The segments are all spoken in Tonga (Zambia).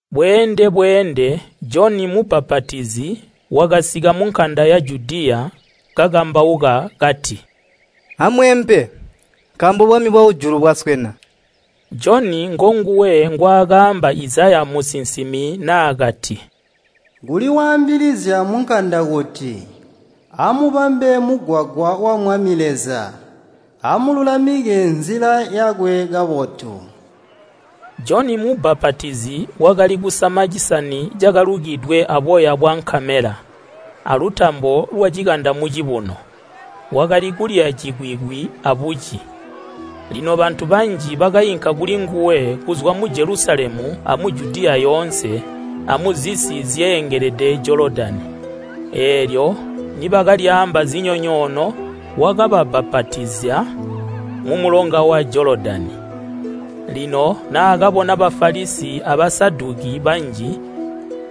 Bweende-bweende Joni mubbapatizi wakasika munkanda ya Judiya kakambauka kati, “Amweempe, nkaambo bwami bwakujulu bwaswena.” Joni ngonguwe ngwaakaamba Izaya musinsimi naakati, “Kuli waambilizya munkanda kuti, ‘Amubambe mugwagwa wa Mwami Leza! Amululamike nzila yakwe kabotu!’” Joni mubbapatizi wakali kusama cisani cakalukidwe aboya bwa nkamela, alutambo lwacikanda mucibuno. Wakali kulya cikwikwi abuci. Lino bantu banji bakainka kulinguwe kuzwa mu Jelusalemu amu Judiya yoonse amuzisi zyeengelede Jolodani. Eelyo nibakalyaamba zinyonyoono wakababbapatizya mumulonga wa Jolodani. Lino naakabona Bafalisi a Basaduki banji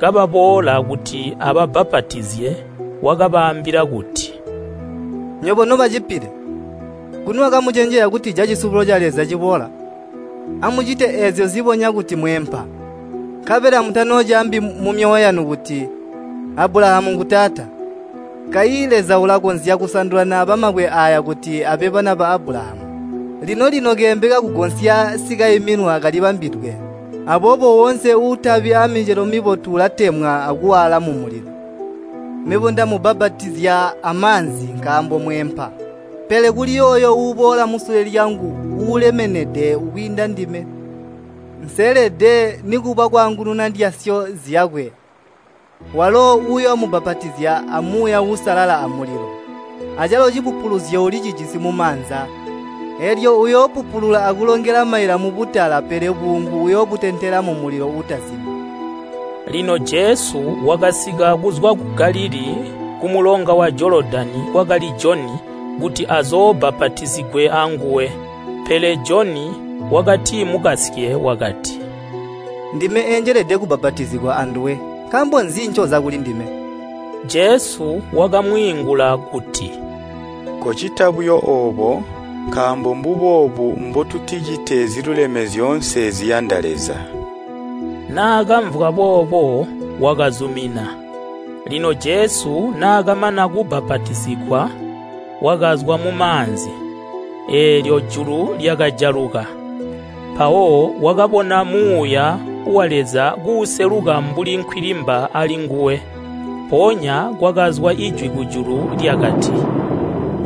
kababoola kuti ababbapatizye wakabaambila kuti, “Nywebo noba cipile! Nguni wakamucenjezya kutija cisubulo ca Leza ciboola? Amucite eezyo zibonya kuti mweempa. Nkabela mutanoocaambi mumyoyo yanu kuti, ‘Abulahamu ngu taata!’ Kayi Leza ulakonzya kusandula naaba mabwe aaya kuti abe bana ba Abulahamu. Lino-lino keembe kakugonsya sikaiminwa kalibambidwe, aboobo woonse uutabi aamicelo mibotu ulatemwa akuwaala mumulilo. Mebo ndamubbapatizya amaanzi nkaambo mweempa, pele kuli yooyo uubola musule lyangu uulemenede kwiinda ndime. Nseelede nikuba kwaangununa ndyasyo zyakwe. Walo uyoomubbapatizya a Muuya Uusalala amulilo. Acalo cipupuluzyo ulicijisi mumaanza, eelyo uyoopupulula akulongela maila mubutala, pele buungu uyoobutentela mumulilo uutazimi.” Lino Jesu wakasika kuzwa ku Galilii kumulonga wa Jolodani kwakali Joni kuti azoobbapatizigwe anguwe. Pele Joni wakatimukasye wakati, “Ndime eenjelede kubbapatizigwa anduwe, nkaambo nzi ncoza kulindime?” Jesu wakamwiingula kuti, “Kocita buyo oobo, nkaambo mbuboobu mbotuticite ziluleme zyoonse ziyanda Leza.” Naakamvwa boobo wakazumina. Lino Jesu naakamana kubbapatizigwa, wakazwa mumaanzi, eelyo julu lyakajaluka, mpawo wakabona Muuya wa Leza kuuseluka mbuli nkwilimba alinguwe, mpoonya kwakazwa ijwi kujulu, lyakati,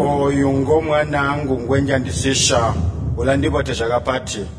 “Ooyu ngo mwanaangu ngwenjandisisya, ulandibotezya kapati!”